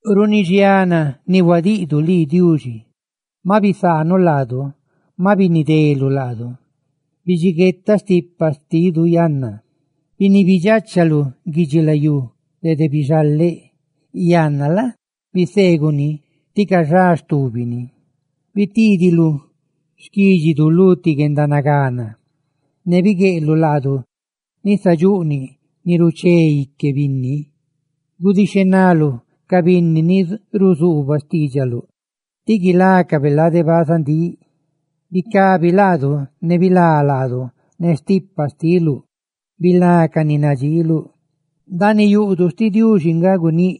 Runi xiana ni huadiꞌdu lii, ay Diuxi, maꞌ bisaanuꞌ laadu, maꞌ binideluꞌ laadu; ¡bidxiguetaꞌ stipa xtidu yanna! Biniibidxachaluꞌ guidxilayú dede bixaleꞌ; ¡yanna la? biseeguꞌ ni ti cayá stubini! Bitiidiluꞌ xquídxiluꞌ lu ti guendanagana, ne bigueꞌluꞌ laadu nisadxuꞌniꞌ ni ruché ique binni. Gudixhenaluꞌ ca binni ni ruzuubaꞌ xtiidxaluꞌ ti guilácabe lade bazandíꞌ. ¡Bicabi laadu ne bilá laadu ne stipa xtiluꞌ! ¡Bilá ca ni nadxiiluꞌ! Ndaaniꞌ yuꞌduꞌ xtiꞌ Diuxi nga guníꞌ: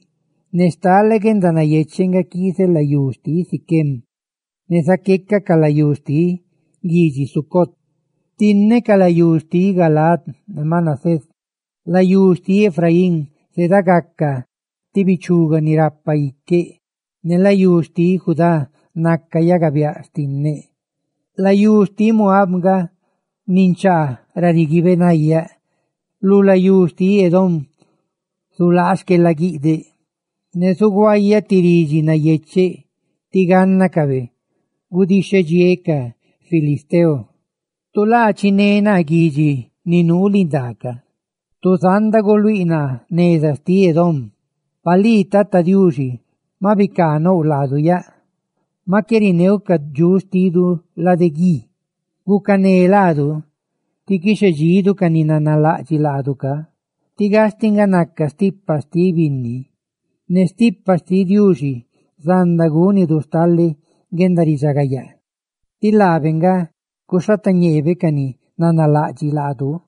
«¡Ne stale guendanayecheꞌ nga quiizeꞌ layú xtiꞌ Siquem, ne zaqueca ca layú xtiꞌ guidxi Sucot! Xtinneꞌ ca layú xtiꞌ Galaad ne Manasés; layú xtiꞌ Efraín zedagaca ti bichuga ni rapa iqueꞌ; ne layú xtiꞌ Judá naca yagabiáꞌa xtinneꞌ; layú xtiꞌ Moab nga ninchaa ra riguiibeꞌ nayaꞌ; lu layú xtiꞌ Edom zulaa xquelaguiꞌdeꞌ; ¡ne zuguayaꞌ ti ridxi nayecheꞌ tí gánnacabe gudixhedxiéꞌ ca filisteo!» Tu laa chiné naa guidxi ni nuu lindaa ca yaꞌ; tu zanda guluíꞌ naa neza xtiꞌ Edom. Pa lii, Tata Diuxi, maꞌ bicaanouꞌ laadu yaꞌ; ¡maꞌ qué rineuꞌ ca dxuꞌ xtidu lade guí! Gucané laadu ti quixhedxidu ca ni nanalaꞌdxiꞌ laadu ca, tí gastiꞌ nga naca stipa xtiꞌ binni. Ne stipa xtiꞌ Diuxi zanda gúnidu stale guendaridxagayaa; ¡laabe nga guxhatañeebe ca ni nanalaꞌdxiꞌ laadu!